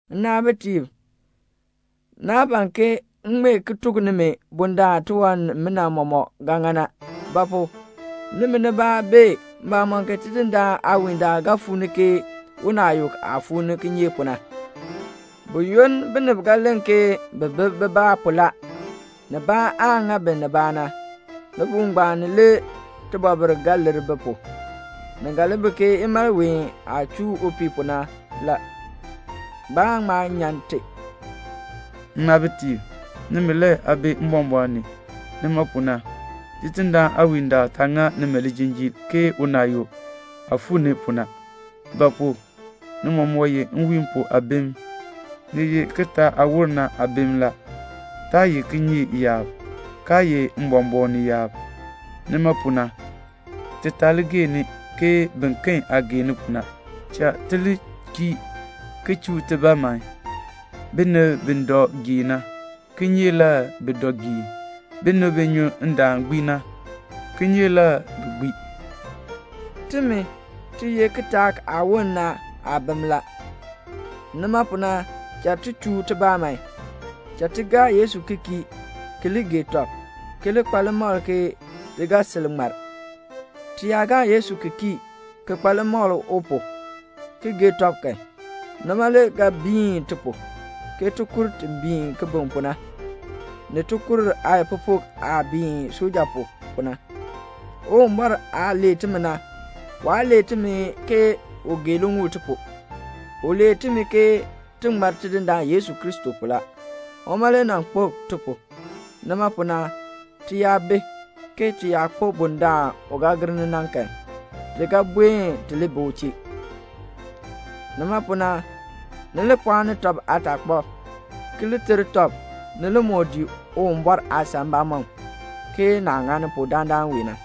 Nnaabitiib, naa ban ke m ŋmee ki tuk nimi bundaln tiwan nimina mɔmɔk ga ŋa na. Ba pu? nimi nibaa bee mbamɔm ke Tidindaan aawiindaal ga fuu ni ke unaayuk aah fuu ni kinyeek pu na. Buyoonn binib ga len ke bi bi bibaa pu la, nibaa aan ŋa bi nibaa na, libuul ngbaan ni le tibɔbil ga lir bi pu. Ni ga li bi ke imalween aah chuu upii pu na la. Baan ŋma nyan ti. Nnaabitiib, nimi le aa bi mbɔmbɔɔn ni. Nima pu na Tidindaan aawiindaal taa ŋa nimi lijinjiir ke unaayuk aah fuu ni pu na. Ba pu? ni mɔmɔk ye nwiin pu aabim. Ni ye kitaak aah woln na aabim la. Taa ye kinyeek yaab, kaa ye mbɔmbɔɔn ni yaab. Nima pu na, ti taa li geeni, ke biken aah geeni pu na. Cha ti li kii, ki chuu tibaa man. Binib bi dɔ geen na, kinyeek le bi dɔ geen. Binib bi nyu ndaan gbii na, kinyeek le bi gbii. Timi, ti ye kitaak aah woln na aabim la, nima pu na cha ti chuu tibaa man. Cha ti gaa Yesu ki kii, ki li gee tɔb, ki li kpa limakl ke ti ga sil ŋmar. Ti yaa gaa Yesu ki kii, ki kpa limakl u pu, ki gee tɔb kan, nima le ga biin ti pu, ke tikur ti biin kibiŋ pu na, ni tikur aayikpupuk aah biin suja pu, pu na. Uwumbɔr aah lee timi na, waa lee timi ke u gee liŋuul ti pu, u lee timi ke ti ŋmar Tidindaan Yesu Kristo pu la. Uma le nan kpo ti pu. Nima pu na, ti yaa bi, ke ti yaa kpo bundaln u ga gir ni na kan, ti ga buen ti li bi u chee. Nima pu na, ni li pɔɔni tɔb aataakpab, ki li ter tɔb ni li moo dii Uwumbɔr aasan mbamɔm, ke naah ŋani pu dandana wee na.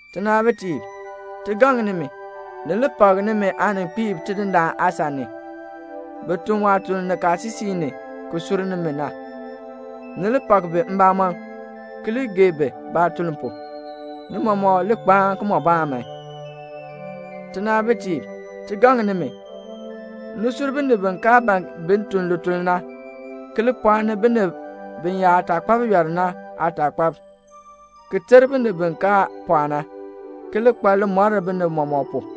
Tinaabitiib, ti gaŋ nimi, ni li pak nimi aaninkpiib Tidindaan aasan ni, bi tun waatuln nikaasisik ni ki sur nimi na. Ni li pak bi mbamɔm, ki li gee bi baatuln pu. Ni mɔmɔk li kpaan kimɔbaan man. Tinaabitiib, ti gaŋ nimi, ni sur binib bi kaa ban bi tun lituln na, ki li pɔɔni binib biyaataakpab yɔl na aataakpab, ki ter binib bi kaa pɔɔ na, ki li kpa limɔr binib mɔmɔk pu.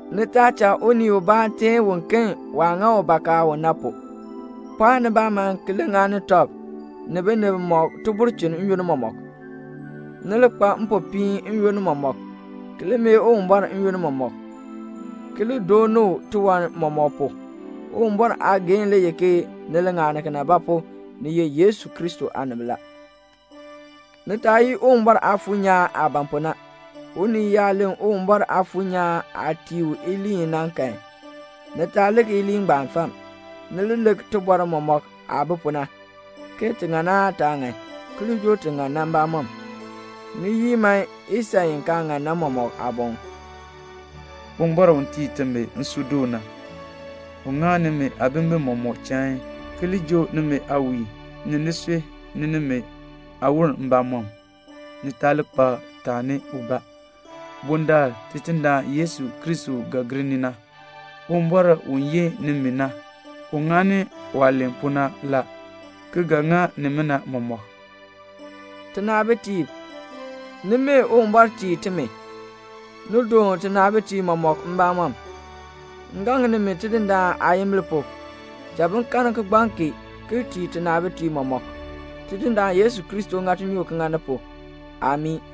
Ni taa cha unii ubaa teen uken waah ŋa bakaa u na pu. Pɔɔn nibaa man ki li ŋani tɔb ni binib mɔmɔk tibulchin n-yoonn mɔmɔk. Ni li kpa mpopiin n-yoonn mɔmɔk, ki li mee Uwumbɔr n-yoonn mɔmɔk, ki li dooni u tiwan mɔmɔk pu. Uwumbɔr aageehn le ye ke ni li ŋani kena; ba pu? ni ye Yesu Kristo aanib. Ni taa yii Uwumbɔr Aafuur nyaan aah ban pu na. Unii yaa len Uwumbɔr Aafuur nyaan aah tii u iliin i na kan, ni taa lik iliin ngbaan fam. Ni li lik tibɔr mɔmɔk aah bi pu na, ke ti ŋan aan taa ŋan, ki li joo ti ŋan na mbamɔm. Ni yii man isan i kaa ŋan na mɔmɔk aaboŋ. Uwumbɔr u tii timi nsuudoon na, ŋa nimi aabimbin mɔmɔk chain, ki li joo nimi aawiin, ni nisui, ni nimi aawon mbamɔm, ni taa li kpa taani ubaa bundaln Tidindaan Yesu Kristo ga gir ni na. Uwumbɔr u yin nimi na, u ŋani waah len pu na la, ki ga ŋa nimina mɔmɔk. Tinaabitiib, ni mee Uwumbɔr tii timi. Ni doon tinaabitiib mɔmɔk mbamɔm. M gaŋ nimi Tidindaan aayimbil pu, cha bin karn kigbaŋ kee ki tii tinaabitiib mɔmɔk. Tidindaan Yesu Kristo ŋa tinyoor ki ŋa ni pu. [Amii.]